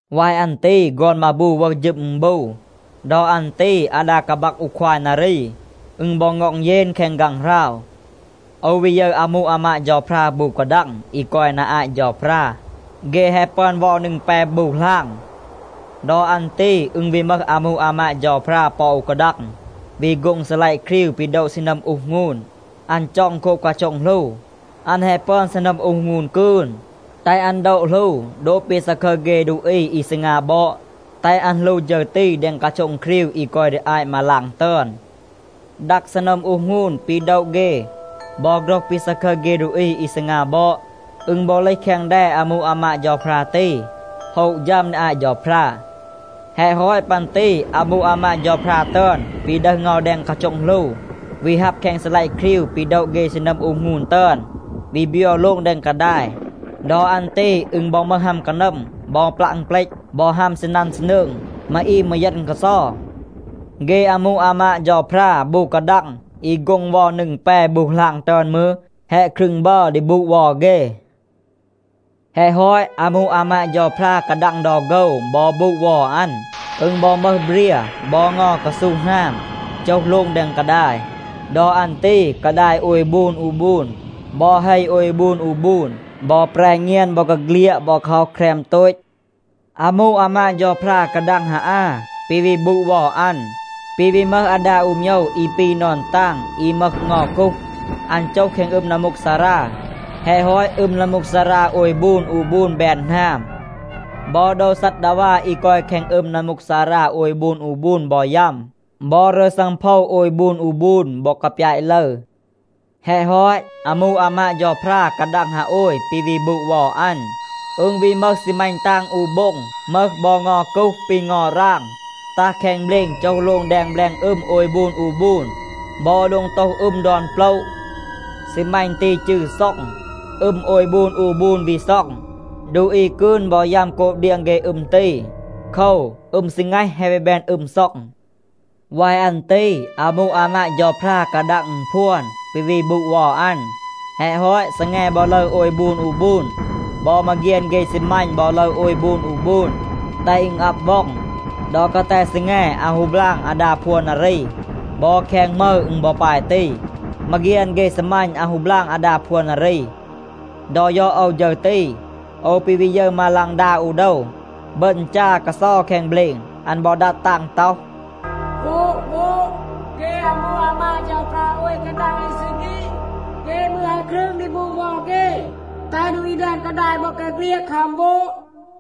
วาย อัน ตี ฆอน มาบู วึห ฌึม อึณบู. ดอ อัน ตี อาดา กาบัก อู ควาย นารี, อึณ บอ ง็อง เยน แคง ฆางหราว. โอว วี ยึร อามู อามาด เฌาพรา บู กาดัง อี กอย นา อาต เฌาพรา. เฆ แฮะ ปึอน เวา นึง แป บู หลาง. ดอ อัน ตี อึณ วี มึห อามู อามาด เฌาพรา ปอ อู กาดัง, วี โฆ็ง ซีลัยะ ครีว ปี โดะ ซีนัม อูห หงูน. อัน จ็อง โคบ กาโช็ง หลู. อัน แฮะ ปึอน ซีนัม อูห หงูน กืน, แตห อัน โดะ หลู โดบ ปี ซาคึร เฆ ดูอี อี ซีงา บอด, แตห อัน หลู ฌึร ตี แดง กาโช็ง ครีว อี กอย ดี อาต มาลาง ตึอน. ดัก ซีนัม อูห หงูน ปี โดะ เฆ บอ โฆรห ปี ซาคึร เฆ ดูอี อี ซีงา บอด, อึณ บอ เลห แคง แด อามู อามาด เฌาพรา ตี, โฮะ ฌัม ดี อาต เฌาพรา. แฮะ ฮอต ปัน ตี อามู อามาด เฌาพรา ตึอน วี ดึห เงา แดง กาโช็ง หลู, วี ฮับ แคง ซีลัยะ ครีว ปี โดะ เฆ ซีนัม อูห หงูน ตึอน, วี บยัว โลง แดง กาดาย. ดอ อัน ตี อึณ บอ มึห ฮัม กานัม บอ ปลัะ อึณเปลต บอ ฮัม ซีนัน ซีนืง. มาอีม มืร เยณ กาเซา. เฆ อามู อามาด เฌาพรา บู กาดัง อี โฆ็ง เวา นึง แป บู หลาง ตึอน มืร, แฮะ ครึง บัร ดี บูด เวา เฆ. แฮะ ฮอต, อามู อามาด เฌาพรา กาดัง ดอ โฆว บอ บูด เวา อัน. อึณ บอ มึห เบรีย บอ เงา กาซู หนาม, โจห โลง แดง กาดาย. ดอ อัน ตี กาดาย โอย บูน อู บูน บอ เฮ โอย บูน อู บูน บอ แปร เงียน บอกาเฆลียด บอ กาฮ็อห แครม โตต. อามู อามาด เฌาพรา กาดัง ฮาอา ปี วี บูด เวา อัน, ปี วี มึห อาดา อู โมยว อี ปี นอน ตาง อี มึห เงา กูห. อัน โจห แคง อึม นัมมูกซารา. แฮะ ฮอต, อึม นัมมูกซารา โอย บูน อู บูน แบน หนาม. บอ โดว ซัดดาวา อี กอย แคง อึม นัมมูกซารา โอย บูน อู บูน บอ ยัม, บอ รึร ซังโพว โอย บูน อู บูน บอ กาปยาต ลึร. แฮะ ฮอต, อามู อามาด เฌาพรา กาดัง ฮาโอย ปี วี บูด เวา อัน, อึณ วี มึห ซีมัณ ตาง อู โบ็ง, มึห บอ เงา กูห ปี เงา ราง, ตัห แคง เบลณ โจห โลง แดง แบลง อึม โอย บูน อู บูน บอ แดง โตห อึม ดอน โปละ. ซีมัณ ตี จืร “ซ็อง.” อึม โอย บูน อู บูน วี ซ็อง. ดูอี กืน บอ ยัม โกบ เดียง เฆ อึม ตี. โคว, อึม ซีแงห แฮะ วี แบน อึม ซ็อง. วาย อัน ตี อามู อามาด เฌาพรา กาดัง อึณพวน ปี วี บูด เวา อัน. แฮะ ฮอต, ซีแง บอ ลึร โอย บูน อู บูน. บอ มาเฆียน เฆ ซีมัณ บอ ลึร โอย บูน อู บูน, แตห อึณ อับ ว็อง. ดอ กาแต ซีแง อาว ฮู บลาง อาดา พวน นารี. บอ แคง หมึร อึณ บอ ปาย ตี. มาเฆียน เฆ ซีมัณ อาว ฮู บลาง อาดา พวน นารี. ดอ ยอด โอว ฌึร ตี, โอว ปี วี ยึร มาฆลาง อู โดว, บึณ จา กาเซา แคง เบลณ. อัน บอ ดัด ตาง ต็อห, “โวด, โวด, เฆ อามู อามาด เฌาพรา โอย กาดัง อี ซี ฆีด, เฆ มืร แฮะ ครึง ดี บูด เวา เฆ, แตห ดูอี แดง กาดาย บอกาเฆลียด คัม โวด.”